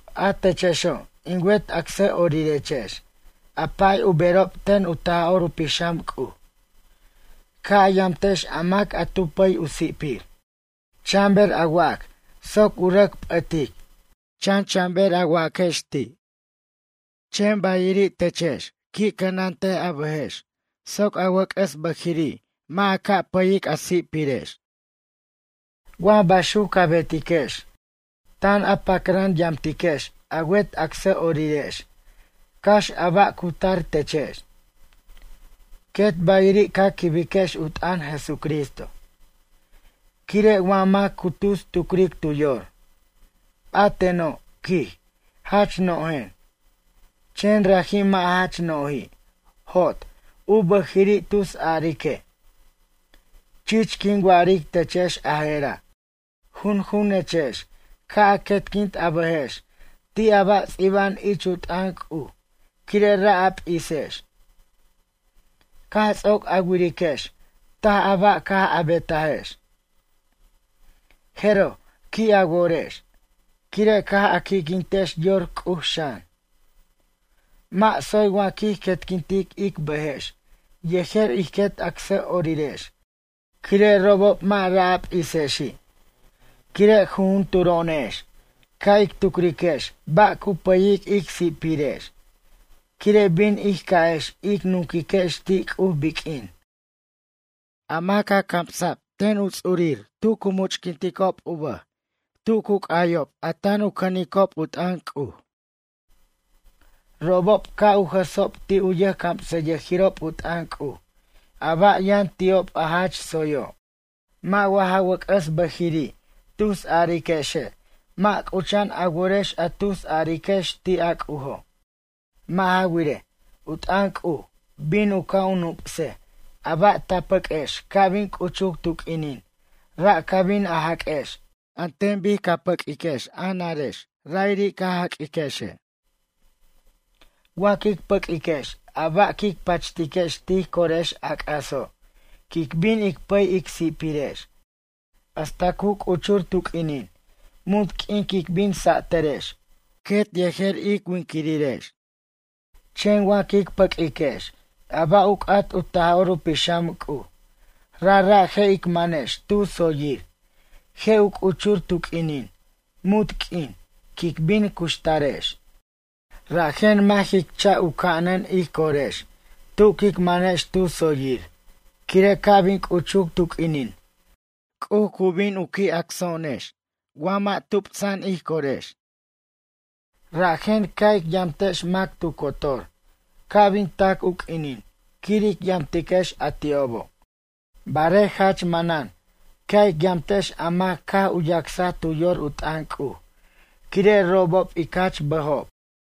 A techexo' in wet acsʌ'orirechex a pay u berob ten u Taj'or u Pixam C'uj. Ca' a yamtex a mac a tu pʌy u si'pir. Chan ber a wac soc u rʌc p'ʌtic, chan chan ber a waquex ti'. Chen bayiri' techex qui' cʌnant a bʌjex soc a wʌc'ʌs bʌjiri' mʌ' a ca' pʌyic a si'pirex. Wa baxuc ca betiquex, tan a pacran yamtiquex a wet acsʌ'orirex cax a ba' cu tar techex. Quet bayiri' ca quibiquex u t'ʌn Jesucristo. Quire' wa mac cu tus tucric tu yor: “A teno', quij, jach no'jen”, chen raji' mʌ' jach no'ji', jot, u bʌjiri' tus arique'. Chich quin wa'aric techex a je'ra', junjunechex ca' a quetquint a bʌjex ti' a ba' ts'iba'an ich u t'ʌn C'uj quire' ra' a p'isex. Caj ts'oc a wiriquex taj a ba' caj a betajex. Jeroj qui' a worex, quire' caj a qui'quintex yor C'uj xan. Mʌ' tsoy wa quij quetquintic ic bʌjex yejer ij quet acsʌ'orirex quire' robob mʌ' ra' a p'isexi'. Quire' jujunturo'onex ca' ic tucriquex ba' cu pʌyic ic si'pirex quire' bin ij ca'ex ic nunquiquex ti' C'uj biq'uin. A maca' a camsa' ten u ts'urir tu cu much'quinticob u bʌj tu cu c'ayob a tan u cʌnicob u t'ʌn C'uj. Robob ca' u jʌsob ti' u yʌjcamsʌyʌjirob u t'ʌn C'uj a ba' yʌn ti'ob a jach tsoyo'. Mʌ' wa ja wʌc'ʌs bʌjiri' tus ariquexe' mʌ' c'ucha'an a worex a tusariquex ti' a C'ujo'. Mʌ' ja wirej, u t'ʌn C'uj bin u ca' u nup'sej, a ba' ta pʌq'uex ca' bin c'uchur tu q'uinin ra' ca bin a jaq'uex an ten ca pʌq'uiquex a narex ra'iri' ca jaq'uiquexe'. Wa quic pʌq'uiquex a ba' quic pachtiquex tij corex a c'aso', quic bin ic pʌy ic si'pirex hasta cu c'uchur tu q'uinin munt q'uin quic bin sa'tʌrex, quet yejer ic winiquirex. Chen wa quic pʌq'uiquex a ba' u c'at u Taj'or u Pixam C'uj rajra' je' ic manex tu tsoyir, je' u c'uchur tu q'uinin, munt q'uin, quic bin cuxtarex. Rajen mʌ' jic cha' u ca'anan ij corex tu quic manex tu tsoyir quire' ca' bin c'uchuc tu q'uinin C'uj bin u ca' u qui' acso'onex wa mʌ' tupsa'an ij corex. Rajen ca' ic yamtex mac tu cotor, ca' bin tac u q'uinin quir ic yamtiquex a ti'obo'. Barej jach manan ca' ic yamtex a mac caj u yacsa tu yor u t'ʌn C'uj, quire' robob ic jach bʌjob.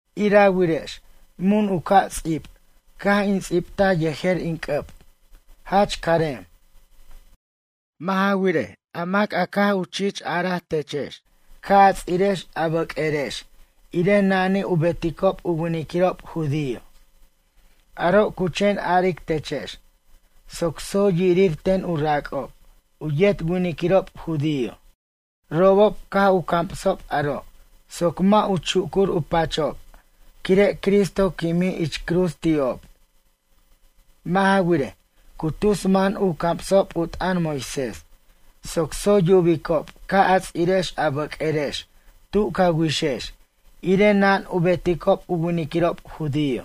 Ira wirex mun u ca' ts'ib caj in ts'ibt yejer in c'ʌb, jach carem. Mʌ' ja wirej, a mac a caj u chich ar techex ca' a ts'irex a bʌq'uerex irej nani u beticob u winiquirob judío. Aro' cu chen aric techex soc tsoy yirir ten u rac'ob, u yet winiquirob judío. Robob caj u camsob aro' soc mʌ' u chucur u pachob quire' Cristo quimij ich cruz ti'ob. Mʌ' ja wirej, cu tus man u camsob u t'ʌn Moisés soc tsoy yubicob ca' a ts'irex a bʌq'uerex tu ca wixex irej nan u beticob u winiquirob judío.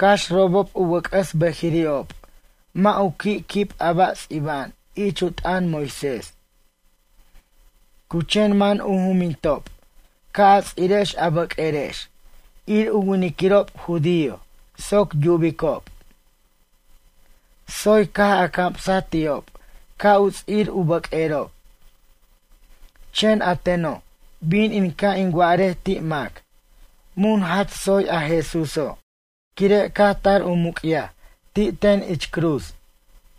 Cax robob u wʌc'ʌs bʌjiri'ob mʌ' u qui' quib a ba' ts'iba'an ich u t'ʌn Moisés. Cu chen man u jumbintob ca' a ts'irex a bʌq'uerex, ir u winiquirob judío soc yubicob: “Tsoy caj a camsaj ti'ob ca' u ts'ir u bʌq'uerob.” Chen a teno', bin in ca' in wa'arej ti' mac, mun jach tsoy a Jesúso', quire' caj tar u muc'yaj ti' ten ich cruz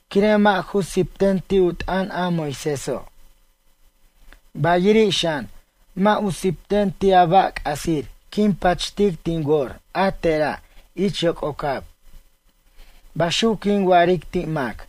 quire' mʌ' ju sipten ti' u t'ʌn a Moiséso'. Bayiri' xan, mʌ' u sipten ti' a ba' c'asir quin pachtic tin wor a tera' ich yoc'ocab. Baxuc quin wa'aric ti' mac.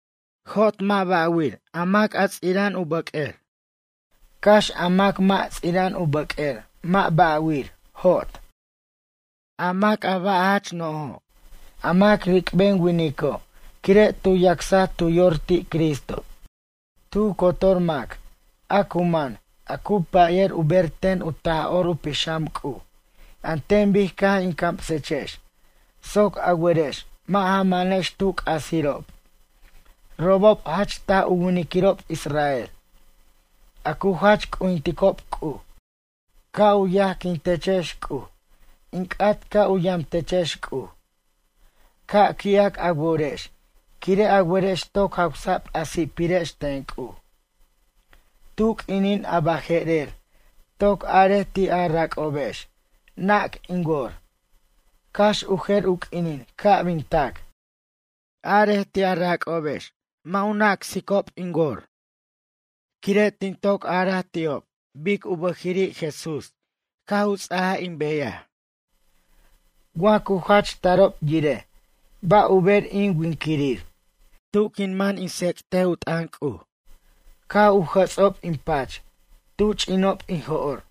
Jot mʌ' ba'wir a mac ts'ira'an u bʌq'uer, cax a mac mʌ' ts'ira'an u bʌq'uer mʌ' ba' wir, jot. A mac u ba' jach no'ojo', a mac ric'ben winico' quire' tu yacsaj tu yor ti' Cristo. Tu cotor mac a cu man a cu pʌyʌr u ber ten u Taj'or u Pixam C'uj an ten bic caj in camsechex soc a werex mʌ' ja manex tu c'asirob, robob jach taj u winiquirob israel, a cu jach c'ujinticob C'uj. Ca' u yajquin techex C'uj, in c'at ca' u yamtechex C'uj. Ca' qui'ac a worex quire' a werex toc jawsa'b a si'pirex ten C'uj. Tu q'uinin a baje'rer toc arej ti' a rac'obex nac in wor, cax u jer u q'uinin ca' bin tac. Arej ti' a rac'obex mʌ' u nacsicob in wor. Quire' tin toc araj ti'ob bic u bʌji'iri' Jesús caj u ts'aj in beyaj. Wa cu jach tarob yirej ba' u ber in winquirir, tu quin man in tsec't u t'ʌn C'uj, caj u jʌts'ob in pach, tu ch'inob in jo'r.